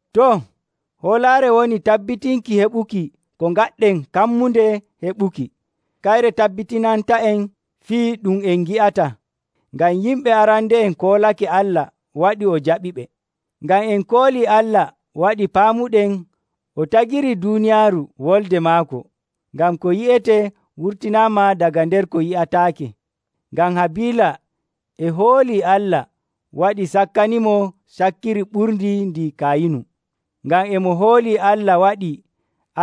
Too, hoolaare woni tabbitinki heɓuki ko ngaɗɗen kammunde heɓuki, kayre tabbitinanta'en fii ɗum en ngi'ataa. Ngam yimɓe arande'en koolake Allah waɗi o jaɓiɓe. Ngam en koolii Allah waɗi paamuɗen o tagirii duuniyaaru wolde maako, ngam ko yi'etee wurtinaama daga nder ko yi'ataake. Ngam Habiila e hoolii Allah waɗi sakkanimo cakkiri ɓurndi ndi Kayinu. Ngam e mo hoolii Allah waɗi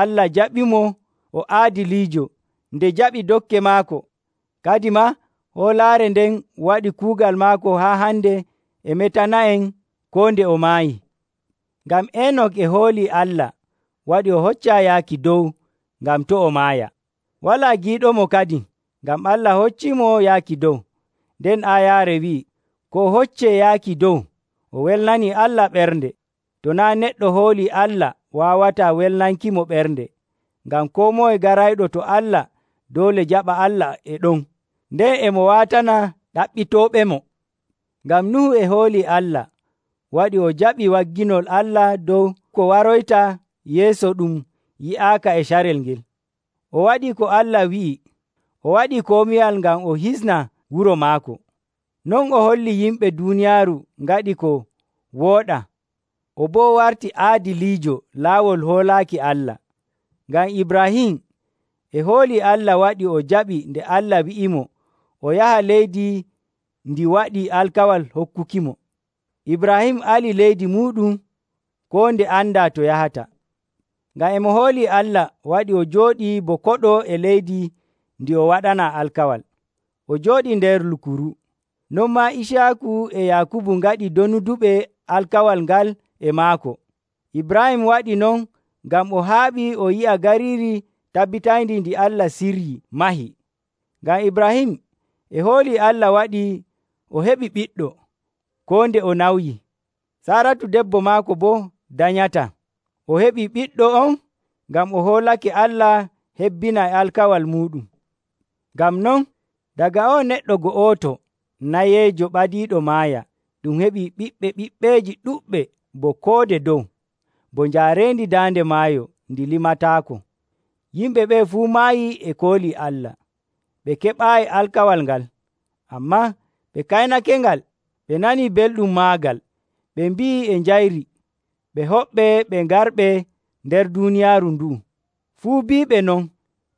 Allah jaɓimo o aadiliijo nde jaɓi dokke maako. Kadimaa hoolaare nden waɗi kuugal maako haa hande e metana'en koo nde o maayi. Ngam Enok e hoolii Allah waɗi o hoccaa yaaki dow ngam to' o maaya. Walaa giiɗomo kadin, ngam Allah hocciimo yaaki dow. Nden aayaare wi'ii, ko o hoccee yaaki dow, o welnanii Allah ɓernde. To naa' neɗɗo hoolii Allah waawataa welnankimo ɓernde, ngam koo moye garayɗo to Allah doole jaɓa Allah e ɗon, nden e mo waatana ɗaɓɓitooɓemo. Ngam Nuhu e hoolii Allah waɗi o jaɓi wagginol Allah dow ko waroyta yeeso ɗum yi'aaka e carel ngel. O waɗii ko Allah wi'i o waɗi komiwal ngam o hisna wuro maako. Non o holli yimɓe duuniyaaru ngaɗii ko wooɗaa, o boo wartii aadiliijo laawol hoolaaki Allah. Ngam Ibraahim e hoolii Allah waɗi o jaɓi nde Allah wi'imo o yaha leydi ndi waɗi alkawal hokkukimo. Ibraahim ali leydi muuɗum koo nde andaa to yahata. Ngam e mo hoolii Allah waɗi o jooɗii bo koɗo e leydi ndi o waɗanaa alkawal. O jooɗii nder lukuru. Non maa Iciyaaku e Yaakubu ngaɗii donuduɓe alkawal ngal e maako. Ibraahim waɗii non ngam o haaɓii o yi'a gariiri tabitayndi ndi Allah siryii, mahi. Ngam Ibraahim e hoolii Allah waɗi o heɓi ɓiɗɗo, koo nde o nawyi. Saaratu debbo maako boo danyataa. O heɓii ɓiɗɗo on ngam o hoolake Allah hebbinay alkawal muuɗum. Ngam non, daga o'o neɗɗo go'oto nayeejo ɓadiiɗo maaya, ɗum heɓii ɓiɓɓe ɓiɓɓeeji ɗuɗɓe bo koode dow, bo njaareendi daande maayo ndi limataako. Yimɓe ɓe'e fuu maayii e koolii Allah. Ɓe keɓaayi alkawal ngal, ammaa ɓe kaynakengal ɓe nanii belɗum maagal. Ɓe mbi'ii e njayri ɓe hoɓɓe ɓe garɓe nder duuniyaaru ndu'u. Fuu biiɓe non,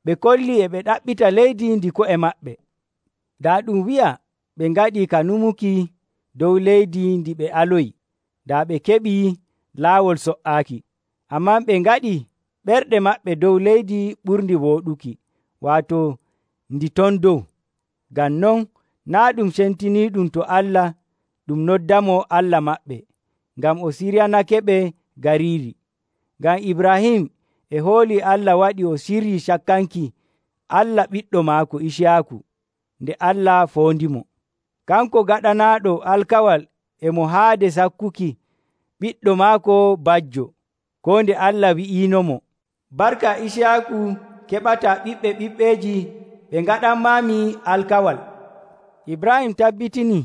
ɓe kollii e ɓe ɗaɓɓita leydi ndi ko'e maɓɓe. Daa ɗum wi'a ɓe ngaɗii ka nyumuki dow leydi ndi ɓe aloyi, daa ɓe keɓii laawol so''aaki. Ammaa ɓe ngaɗii ɓerɗe maɓɓe dow leydi ɓurndi wooɗuki, waato ndi ton dow. Ngam non, naa' ɗum cemtiniiɗum to Allah ɗum noddamo Allah maɓɓe, ngam o siryanakeɓe gariiri. Ngam Ibraahim e hoolii Allah waɗi o siryii sakkanki Allah ɓiɗɗo maako Iciyaaku nde Allah foondimo. Kanko gaɗanaaɗo alkawal e mo haade sakkuki ɓiɗɗo maako bajjo, koo nde Allah wi'iinomo, “Barka Iciyaaku keɓataa ɓiɓɓe ɓiɓɓeeji ɓe ngaɗanmaami alkawal.” Ibraahim tabbitinii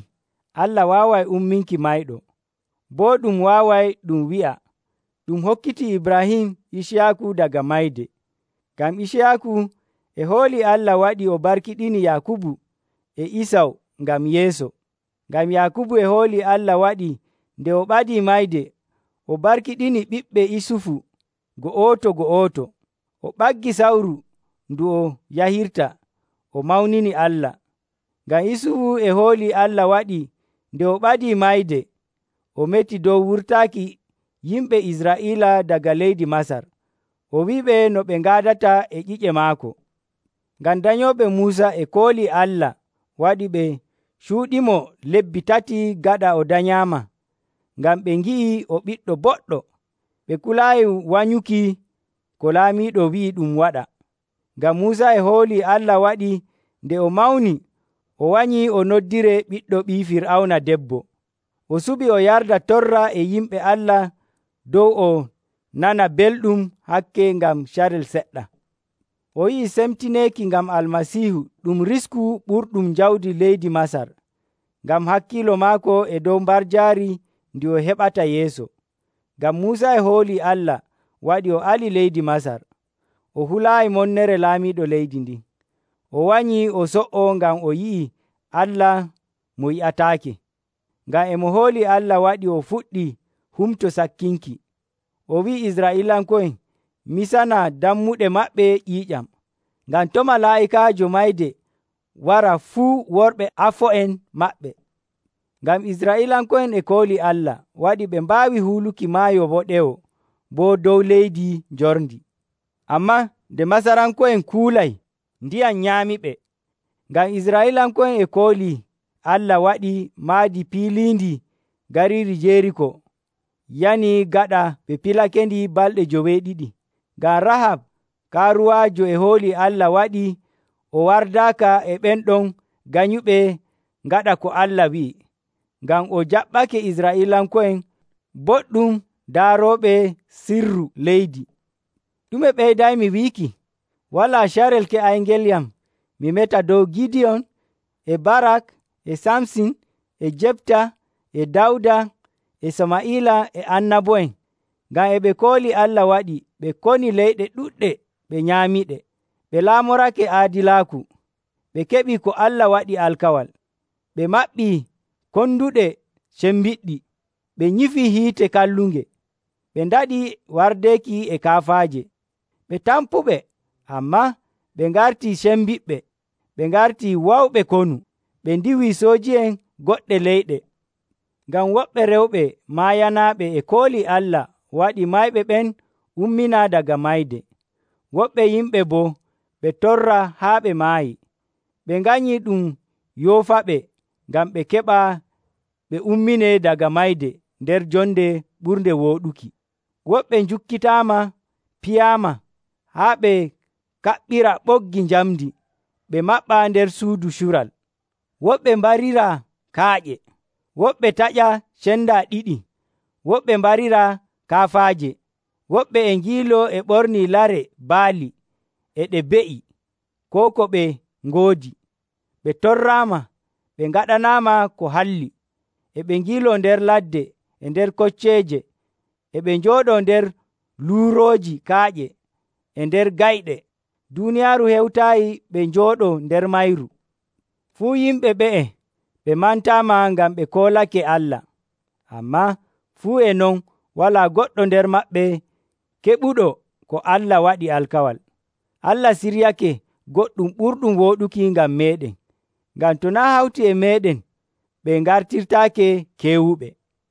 Allah waaway umminki mayɗo. Boo ɗum waaway ɗum wi'a, ɗum hokkitii Ibraahim Iciyaaku daga mayde. Ngam Iciyaaku e hoolii Allah waɗi o barkiɗini Yaakubu e Isaw ngam yeeso. Ngam Yaakubu e hoolii Allah waɗi nde o ɓadii mayde, o barkiɗini ɓiɓɓe Isufu go'oto‑go'oto. O ɓaggi sawru ndu o yahirta, o mawnini Allah. Ngam Isufu e hoolii Allah waɗi nde o ɓadii mayde, o meti dow wurtaaki yimɓe Israa'iila daga leydi Masar, o wi'iɓe no ɓe ngaadata e ƴi'e maako. Ngam danyooɓe Muusa e koolii Allah waɗi ɓe cuuɗimo lebbi tati gaɗa o danyaama, ngam ɓe ngi'ii o ɓiɗɗo boɗɗo, ɓe kulaayi wanyuki ko laamiiɗo wi'i ɗum waɗa. Ngam Muusa e hoolii Allah waɗi nde o mawni o wanyi o noddiree ɓiɗɗo ɓii Fir'awna debbo. O suɓii o yarda torra e yimɓe Allah dow o nana belɗum hakke ngam carel seɗɗa. O yi'ii semtineeki ngam Almasiihu ɗum risku ɓurɗum jawdi leydi Masar, ngam hakkiilo maako e dow mbarjaari ndi o heɓata yeeso. Ngam Muusa e hoolii Allah waɗi o ali leydi Masar, o hulaayi monnere laamiiɗo leydi ndin. O wanyi o so''o ngam o yi'ii Allah mo yi'ataake. Ngam e mo hoolii Allah waɗi o fuɗɗi Humto Sakkinki. O wi'i Israa'iilanko'en misana dammuɗe maɓɓe ƴiiƴam, ngam to' Malaa'ikaajo Mayde wara fuu worɓe afo'en maɓɓe. Ngam Israa'iilanko'en e koolii Allah waɗi ɓe mbaawi huuluki Maayo Woɗewo bo dow leydi njorndi. Ammaa nde Masaranko'en kuulay, ndiyam nyaamiɓe. Ngam Israa'iilanko'en e koolii Allah waɗi maadi piliindi gariiri Jeriiko yani gaɗa ɓe pilakendi balɗe joweeɗiɗi. Ngam Rahab kaaruwaajo e hoolii Allah waɗi o wardaaka e ɓen ɗon ganyuɓe ngaɗa ko Allah wi'i, ngam o jaɓɓake Israa'iilanko'en boɗɗum daarooɓe sirru leydi. Ɗume ɓeydaymi wiiki? Walaa carel keƴayngelyam mi meta dow Gidiyon, e Barak, e Samsin, e Jepta, e Dawda, e Samaa'ila, e annabo'en, ngam e ɓe koolii Allah waɗi ɓe koni leyɗe ɗuɗɗe ɓe nyaamiɗe. Ɓe laamorake aadilaaku, ɓe keɓi ko Allah waɗi alkawal. Ɓe maɓɓii konduɗe cembiɗɗi. Ɓe nyifii hiite kallunge, ɓe ndaɗii wardeeki e kaafaaje. Ɓe tampuɓe, ammaa ɓe ngartii cembiɗɓe. Ɓe ngartii wawɓe konu, ɓe ndiiwii sooji'en goɗɗe leyɗe. Ngam woɓɓe rewɓe maayanaaɓe e koolii Allah waɗi mayɓe ɓen umminaa daga mayde. Woɓɓe yimɓe boo ɓe torraa haa ɓe maayi, ɓe nganyii ɗum yoofaɓe ngam ɓe keɓa ɓe umminee daga mayde nder jonde ɓurnde wooɗuki. Woɓɓe njukkitaama piyaama, haa ɓe kaɓɓiraa ɓoggi njamndi ɓe maɓɓaa nder suudu cural. Woɓɓe mbariraa kaaƴe, woɓɓe taƴaa cendaa ɗiɗi, woɓɓe mbariraa kaafaaje. Woɓɓe e ngiiloo e ɓornii lare baali e ɗe be'i, koo ko ɓe ngoodi, ɓe torraama, ɓe ngaɗanaama ko halli. E ɓe ngiiloo nder ladde e nder kocceeje, e ɓe njooɗoo nder luurooji kaaƴe e nder gayɗe. Duuniyaaru hewtaayi ɓe njooɗoo nder mayru. Fuu yimɓe ɓe'e ɓe mantaama ngam ɓe koolake Allah, ammaa fuu e non walaa goɗɗo nder maɓɓe keɓuɗo ko Allah waɗi alkawal. Allah siryake goɗɗum ɓurɗum wooɗuki ngam meeɗen, ngam to naa' hawti e meeɗen, ɓe ngartirtaake keewuɓe.